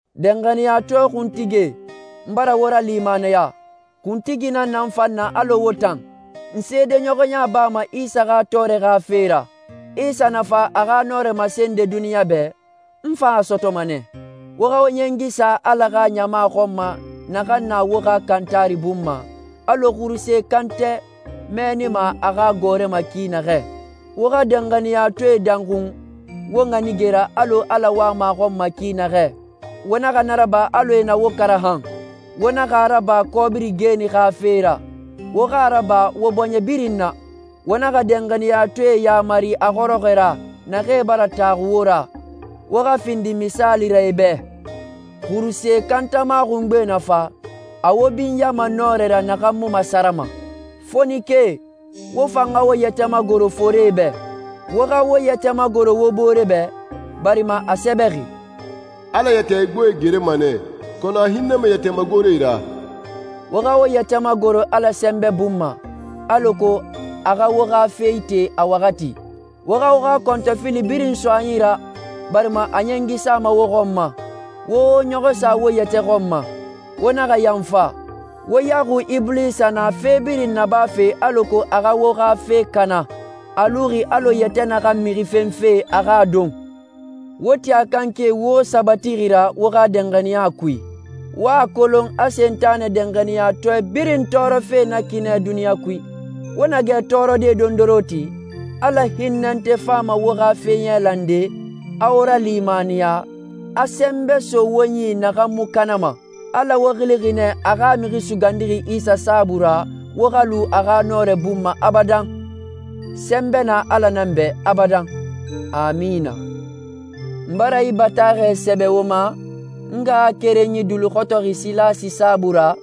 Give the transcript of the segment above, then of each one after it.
Danxaniyatɔɛ kuntigie, n bara wo ralimaniya. Kuntigi nan n fan na alɔ wo tan. N seedeɲɔxɔya bama Isa xa tɔɔrɛ xa fe ra. Isa na fa a xa nɔrɛ masende duniɲa bɛ, n fan a sɔtɔma nɛ. Wo xa wo ɲɛngi sa Ala xa ɲama xɔn ma naxan na wo xa kantari bun ma, alɔ xuruse kantɛ mɛɛnima a xa gɔɔrɛ ma ki naxɛ. Wo xa danxaniyatɔɛe danxun wo ɲanige ra alɔ Ala wama a xɔn ma ki naxɛ. Wo naxa na raba alɔ e na wo karaxan. Wo naxa a raba kɔbiri geeni xa fe ra, wo xa a raba wo bɔɲɛ birin na. Wo naxa danxaniyatɔɛe yamari a xɔrɔxɔɛ ra, naxee bara taxu wo ra. Wo xa findi misaali ra e bɛ. Xuruse kantama xungbe na fa, a wo binyama nɔrɛ ra naxan mu masarama. Fonikee, wo fan xa wo yɛtɛ magoro forie bɛ. Wo xa wo yɛtɛ magoro wo bore bɛ, barima a sɛbɛxi, «Ala yɛtɛ igboe gerema nɛ, kɔnɔ a hinnɛma yɛtɛ magoree ra.» Wo xa wo yɛtɛ magoro Ala sɛnbɛ bun ma, alako a xa wo xa fe ite a waxati. Wo xa wo xa kɔntɔfili birin so a yi ra, barima a ɲɛngi sama wo xɔn ma. Wo wo ɲɔxɔ sa wo yɛtɛ xɔn ma. Wo naxa yanfa. Wo yaxui Ibulisa na fe birin nabafe alako a xa wo xa fe kana. A luxi alɔ yɛtɛ naxan mixi fenfe a xa a don. Wo ti a kanke i wo sabatixi ra wo xa danxaniya kui. Wo a kolon a Sentanɛ danxaniyatɔɛ birin tɔɔrɔfe na ki nɛ duniɲa kui. Wo na gɛ tɔɔrɔde dondoronti, Ala hinnɛnte fama wo xa fe yailande, a wo ralimaniya, a sɛnbɛ so wo yi naxan mu kanama. Ala wo xilixi nɛ a xa Mixi Sugandixi Isa saabui ra wo xa lu a xa nɔrɛ bun ma abadan. Sɛnbɛ na Ala nan bɛ abadan. Amina. N bara yi bataaxɛ sɛbɛ wo ma, n ngaxakerenyi duluxɔtɔxi Silasi saabui ra,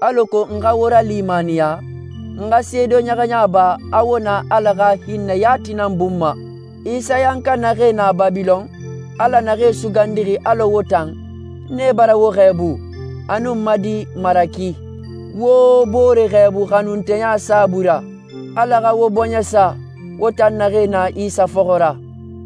alako n xa wo ralimaniya, n xa seedeɲɔxɔya ba a wo na Ala xa hinnɛ yati nan bun ma. Isayanka naxee na Babilɔn, Ala naxee sugandixi alɔ wo tan, nee bara wo xɛɛbu, a nun n ma di Maraki. Wo wo bore xɛɛbu xanunteya sunbui ra. Ala xa wo bɔɲɛ sa, wo tan naxee na Isa fɔxɔ ra.